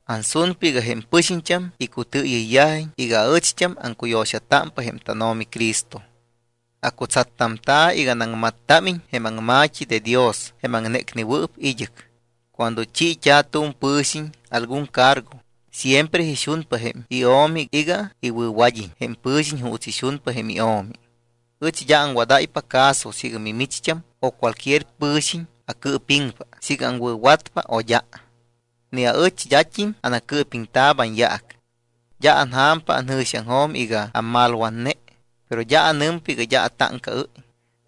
Ansunpa iga jém pɨxiñt́am icutɨɨyɨyyajiñ iga ɨcht́am aŋcuyo̱xatámpa jém tánO̱mi Cristo. Acutsattamta̱ iga anaŋmattámiñ jém aŋma̱t́i de Dios jém aŋnécnewɨɨp id́ɨc. Cuando chiit́a̱ tu̱m pɨ̱xiñ algun cargo siempre ixunpa jém io̱mi iga iwɨ̱wad́iñ jém pɨ̱xiñ juuts ixunpa jém io̱mi. Ɨch d́a aŋwadáypa caso siiga micht́am o cualquier pɨ̱xiñ acɨɨpiŋpa siiga aŋwɨ̱watpa o d́a. Ni aɨch d́at́im anacɨɨpiŋta̱p anyaac. D́a anja̱mpa anjɨ̱xiaŋjo̱m iga ammalwatne, pero d́a anɨmpa iga d́a atáŋcaɨ́y.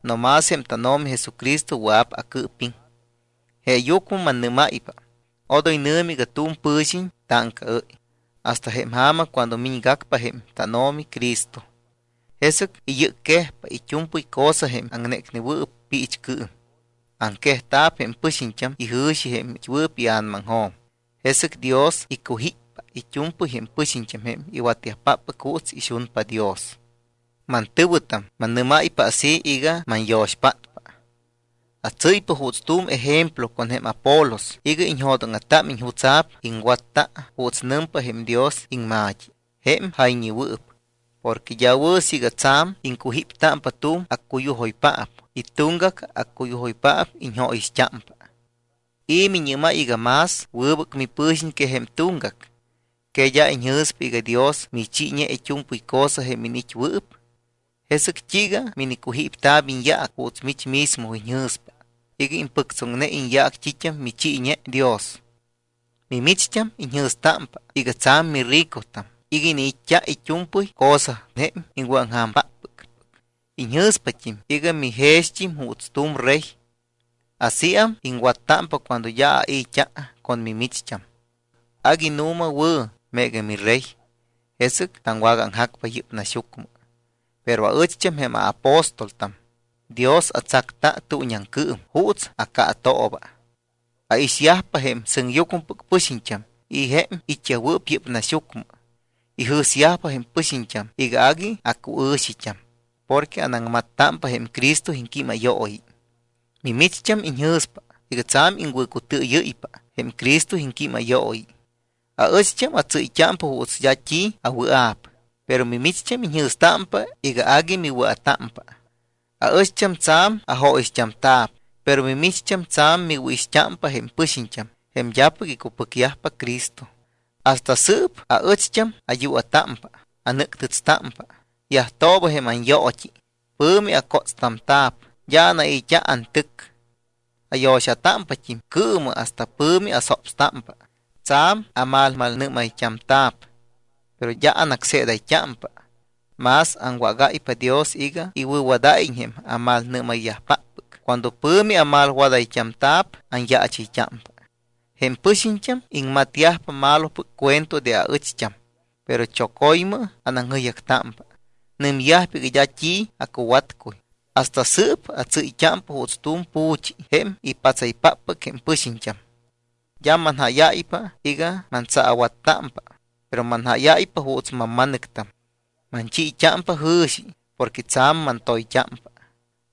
No más jém tánO̱mi Jesucristo wɨa̱p acɨɨpiŋ. Jeeyucmɨ mannɨ́máypa, odoy nɨ̱mɨ iga tu̱m pɨ̱xiñ táŋcaɨ́y hasta jém ja̱ma cuando miñgacpa jém tánO̱mi Cristo. Jesɨc iyɨcquejpa it́u̱mpɨy cosa jém aŋnécnewɨɨp piichcɨɨm. Aŋquejta̱p jém pɨxiñt́am ijɨ̱xi jém it́wɨɨp ia̱namaŋjo̱m. Jesɨc Dios icujíppa it́u̱mpɨy jém pɨxiñt́am jém iwatyajpáppɨc juuts ixunpa Dios. Mantɨ̱wɨtam, mannɨ́máypa así iga manyo̱xpátpa. Atsɨ́ypa juuts tu̱m ejemplo con jém Apolos iga iñjo̱dóŋa̱támiñ jutsa̱p iŋwatta juuts nɨmpa jém Dios iŋma̱t́i jém jayñewɨɨp. Porque d́a wɨ̱ siiga tsa̱m iŋcujíptámpa tu̱m accuyujoypaap y tuŋgac accuyujoypaap iñjóyixt́ámpa. ¿I̱ miñɨ́máy iga más wɨbɨc mipɨ̱xiñ que jém tuŋgac? ¿Que d́a iñjɨ̱spa iga Dios michiiñe it́u̱mpɨy cosa jém iniit́wɨɨp? ¿Jesɨc t́iiga minicujípta̱p iñyaac juuts mich mismo iñjɨ̱spa iga impɨctsoŋne iñyaac t́it́am michiiñe Dios? Mimicht́am iñjɨ̱stámpa iga tsa̱m miricotam iga iniit́t́a it́u̱mpɨy cosa jém iŋwɨ̱aŋja̱mpáppɨc. Iñjɨ̱spat́im iga mijext́im juuts tu̱m rey. Asíam iŋwattámpa cuando d́a ai̱t́a con mimicht́am. Agui nu̱ma wɨ̱ meega mirey, jesɨc taŋwagaaŋjacpa yɨ́p naxyucmɨ. Pero aɨcht́am, jém aapóstoltam, Dios atsacta tuuñiaŋcɨɨm juuts acaatooba. Aixyajpa jém sɨŋyucmɨpɨc pɨxiñt́am y jém it́yajwɨɨp yɨ́p naxyucmɨ. Ijɨ̱syajpa jém pɨxiñt́am iga agui acuɨ̱xit́am porque anaŋmattámpa jém Cristo iŋquímayooyi. Mimicht́am iñjɨ̱spa iga tsa̱m iŋwɨ̱cutɨɨyɨ́ypa jém Cristo iŋquímayooyi. Aɨcht́am atsɨ́yt́ámpa juuts d́a t́i awɨa̱p, pero mimicht́am iñjɨ̱stámpa iga agui miwɨa̱támpa. Aɨcht́am tsa̱m ajóyixt́amta̱p, pero micht́am tsa̱m miwɨ̱ixt́ámpa jém pɨxiñt́am, jém d́apɨc icupɨcyajpa Cristo. Hasta sɨɨp aɨcht́am ayua̱támpa, anɨ́ctɨtstámpa, yajtooba jém anyoot́i, pɨ̱mi acótstamta̱p, d́a anai̱t́a antɨc. Ayo̱xatámpat́im cɨɨmɨ hasta pɨ̱mi asopstámpa. Tsa̱m amalmalnɨ́mayt́amta̱p, pero d́a anácseedayt́ámpa, mas aŋwagáypa Dios iga iwɨ̱wadáyiñ jém amalnɨ́mayyajpáppɨc. Cuando pɨ̱mi amalwadayt́amta̱p, anyaachɨyt́ámpa. Jém pɨxiñt́am iŋmatyajpa malopɨc cuento de aɨcht́am, pero choco̱ymɨ anaŋjɨyjactámpa. Nɨmyajpa iga d́a t́i acuwatcuy. Hasta sɨɨp atsɨ́yt́ámpa juuts tu̱m pu̱chi jém ipatsayyajpáppɨc jém pɨxiñt́am. D́a manjáyáypa iga mantsaawattámpa, pero manjáyáypa juuts mamma̱nɨctam. Manchiit́ámpa jɨ̱xi porque tsa̱m mantoyt́ámpa.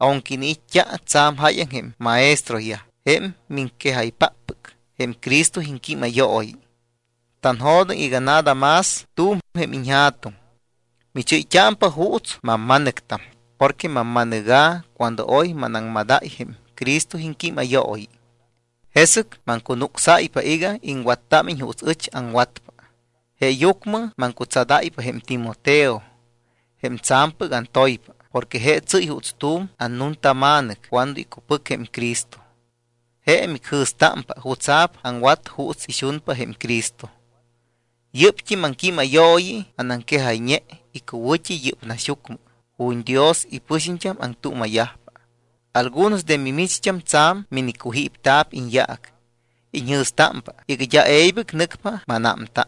Aunque iniit́t́a tsa̱m jáyaŋ jém maestroyaj, jém miŋquejaypáppɨc jém Cristo iŋquímayooyi, tanjo̱doŋ iga nada más t́u̱m jém iñja̱tuŋ. Michɨ́yt́ámpa juuts mamma̱nɨctam porque mamma̱nɨga̱ cuando oy manaŋmadayt́a jém Cristo iŋquímayooyi. Jesɨc maŋcunucsáypa iga iŋwattámiñ juuts ɨch aŋwatpa. Jeeyucmɨ maŋcutsadáypa jém Timoteo jém tsa̱mpɨc antoypa porque je tsɨ́y juuts tu̱m annuntama̱nɨc cuando icupɨc jém Cristo. Je micjɨ̱stámpa jutsa̱p aŋwat juuts ixunpa jém Cristo. Yɨ́pt́im aŋquímayooyi anaŋquejayñe icuwɨ̱t́i yɨ́p naxyucmɨ ju̱t́ Dios ipɨxiñt́am aŋtuuma̱yajpa. Algunos de mimicht́am tsa̱m minicujípta̱p iñyaac. Iñjɨ̱stámpa iga d́a e̱ybɨc nɨcpa mánámta.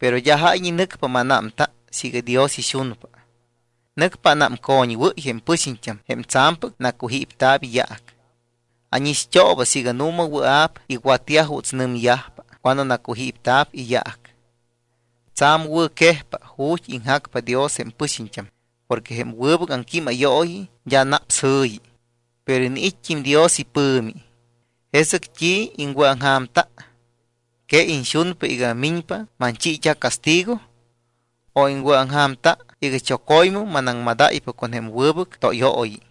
Pero d́a jáyñe nɨcpa mánámta siiga Dios ixunpa. Nɨcpa anámcoñwɨ́y jém pɨxiñt́am jém tsa̱mpɨc nacujípta̱p iyaac. Ánixt́ooba siiga nu̱ma wɨa̱p iwatyaj juuts nɨmyajpa cuando nacujípta̱p iyaac. Tsa̱m wɨ̱quejpa ju̱t́ iŋjacpa Dios jém pɨxiñt́am porque jém wɨbɨc aŋquímayooyi d́a naps jɨ̱yi, pero iniit́t́im Dios ipɨ̱mi. ¿Jesɨc t́i iŋwɨ̱aŋja̱mta? ¿Que iñxunpa iga miñpa manchiit́a castigo? ¿O iŋwɨ̱aŋja̱mta iga choco̱ymɨ manaŋmadáypa con jém wɨbɨc tóyooyi?